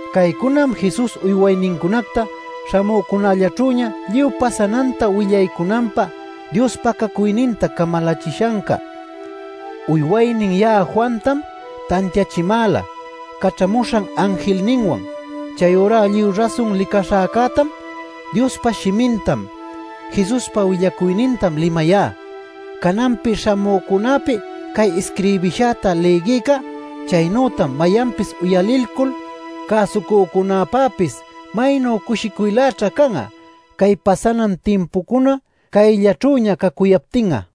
Caycunam Jesus uywaynincunacta śhamücunällaćhüña lluy pasananta willaycunanpä Dios pacacuyninta camalachishanca. Uywaynin ya'a Juantam tantiachimäla caćhamuśhan anjilninwan. Chayurá lluy rasun licaśhäcätam, Diospa shimintam, Jesuspa willacuynintam limayá. Cananpi śhamücunäpi cay isquirbishäta lïgïca chaynütac mayanpis uyaliycul cäsucücunäpäpis maynu cushicuyläćha can'a cay pasanan timpucuna cayllaćhüña cacuyaptin'a.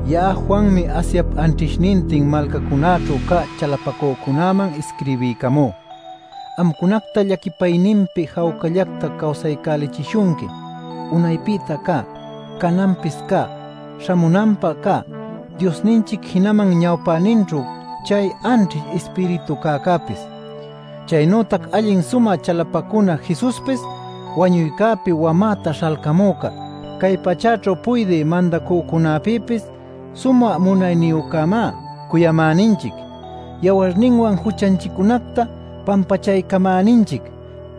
Ya'a Juanmi Asiap anćhishnintin malcancunaćhu cä chalapacücunäman isquirbiycamú. Amcunacta llaquipayninpi jawcallacta cawsaycälichishunqui unaypïta cä, cananpis cä, śhamunanpä cä Diosninchic, jinaman ñawpäninćhu chay anćhish ispiritu cäcäpis, chaynütac allin sumä chalapacuna Jesuspis, wañuycäpi wamäta śhalcamüca, cay pachäćhu puydï mandacücunäpïpis sumä munayniyücämá. ¡Cuyamäninchic yawarninwan juchanchiccunacta pampachaycamäninchic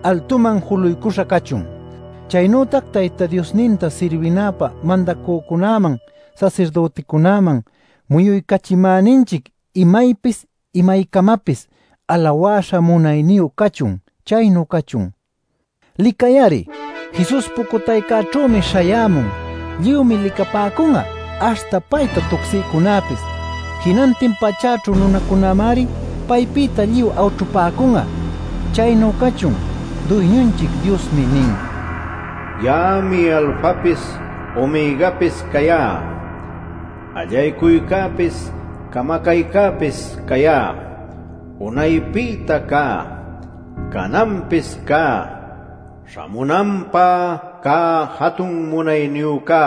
altuman juluycuśha cachun! ¡Chaynütac Tayta Diosninta sirbinapä mandacücunäman sasirdüticunäman muyuycachimäninchic imaypis imaycamapis alawäśha munayniyu cachun! Chaynu cachun. Licay-ari. Jesus pucutaycäćhümi śhayämun. Lluymi licapäcun'a aśhta payta tucsïcunäpis. Jinantin pachäćhu nunacunämari paypïta lluy awćhupäcun'a. Chaynu cachun. Duyñunchic Diosmi nin: “Ya'ami Alfapis Omegapis cayá; allaycuycäpis camacaycäpis cayá; unaypïta cä, cananpis cä, śhamunanpä cä jatun munayniyücá”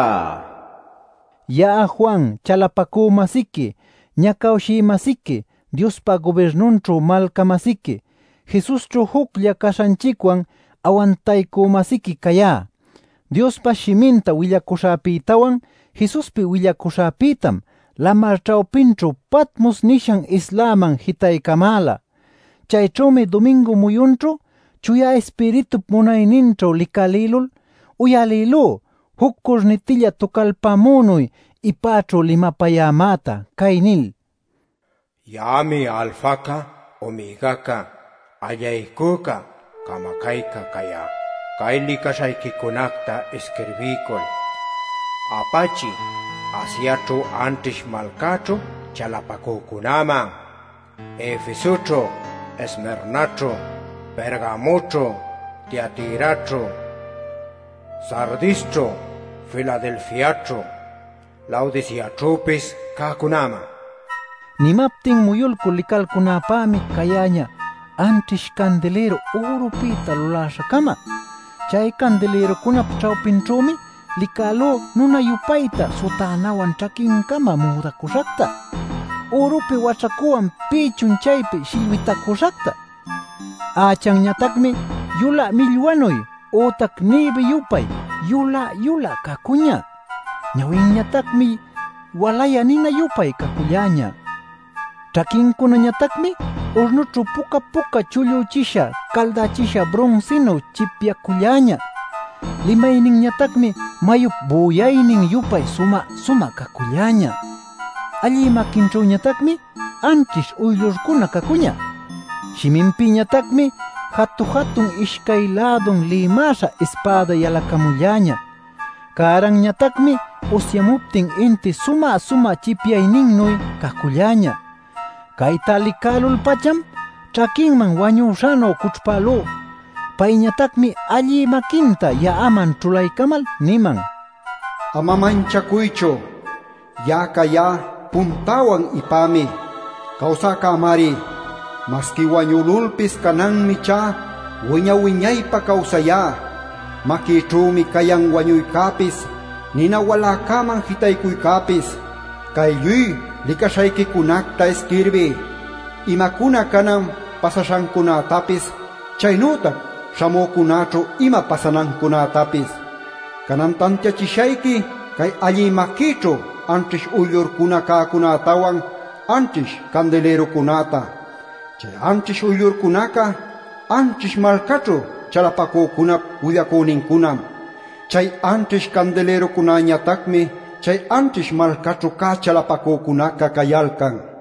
nil. Ya'a Juan, chalapacü-masiqui, ñacawshï-masiqui, Diospa gubirnunćhu malca-masiqui, Jesusćhu juclla caśhanchicwan awantaycü-masiquim cayá. Diospa shiminta willacuśhäpïtawan Jesuspi willacuśhäpïtam lamar ćhawpićhu Patmos nishan islaman jitaycamäla. Chayćhümi dumingu muyunćhu Chuya Ispiritup munayninćhu licalïlul uyalïlú juc curnitilla tucalpämünuy ipäćhu limapayämäta, cay nil: “Ya'ami Alfaca Omegaca; allaycuyca camacayca cayá. Cay licaśhayquicunacta isquirbiycul apachiy Asiaćhu anćhish malcaćhu chalapacücunäman: Efesoćhu, Esmirnaćhu, Pergamoćhu, Tiatiraćhu, Sardisćhu, Filadelfiaćhu, Laodiceaćhüpis cäcunäman” nin. Nimaptin muyulcul licalcunäpämi cayäñä anćhish candilïru ürupïta luläśha-cama. Chay candilïrucunap ćhawpinćhümi licälú nuna-yupayta sutänawan ćhaquincama müdacuśhacta, ürupi waćhacuwan pïchun chaypi shillwitacüśhacta. Ächanñatacmi yulä millwanuy ütac ñïbi-yupay yulä-yulä cacuñä; ñawinñatacmi walayä nina-yupay caculläñä. Ćhaquincunañatacmi urnućhu puca-puca chullüchisha caldächisha brunsinuy chipyaculläñä; limayninñatacmi mayup büyaynin-yupay sumä-sumä caculläñä. Allï maquinćhüñatacmi anćhish uyllurcuna cacuñä; shiminpïtañatacmi jatu-jatun ishcay lädun lïmäśha ispäda yalacamulläñä; cäranñatacmi usyamuptin intip sumä-sumä chipyayninnuy caculläñä. Cayta licälul-pacham ćhaquinman wañüśhanuy cućhpälú; payñatacmi allï maquinta ya'aman ćhulaycamal niman: “Ama manchacuychu. Ya'a cayá Puntäwan Ipämi. Cawsäcämari. Masqui wañülulpis cananmi ichá wiña-wiñaypä cawsayá. Maquïćhümi cayan wañuycäpis, nina waläcäman jitaycuycäpis. Cay lluy licaśhayquicunacta isquirbiy, imacuna canan pasaśhancunätapis, chaynütac śhamücunäćhu ima pasanancunätapis. Canan tantiachishayqui cay allï maquïćhu anćhish uyllurcuna cäcunätawan anćhish candilïrucunäta: chay anćhish uyllurcunaca anćhish malcaćhu chalapacücunap willacünincunam. Chay anćhish candilïrucunäñatacmi chay anćhish malcaćhu cä chalapacücunaca cayalcan” nil.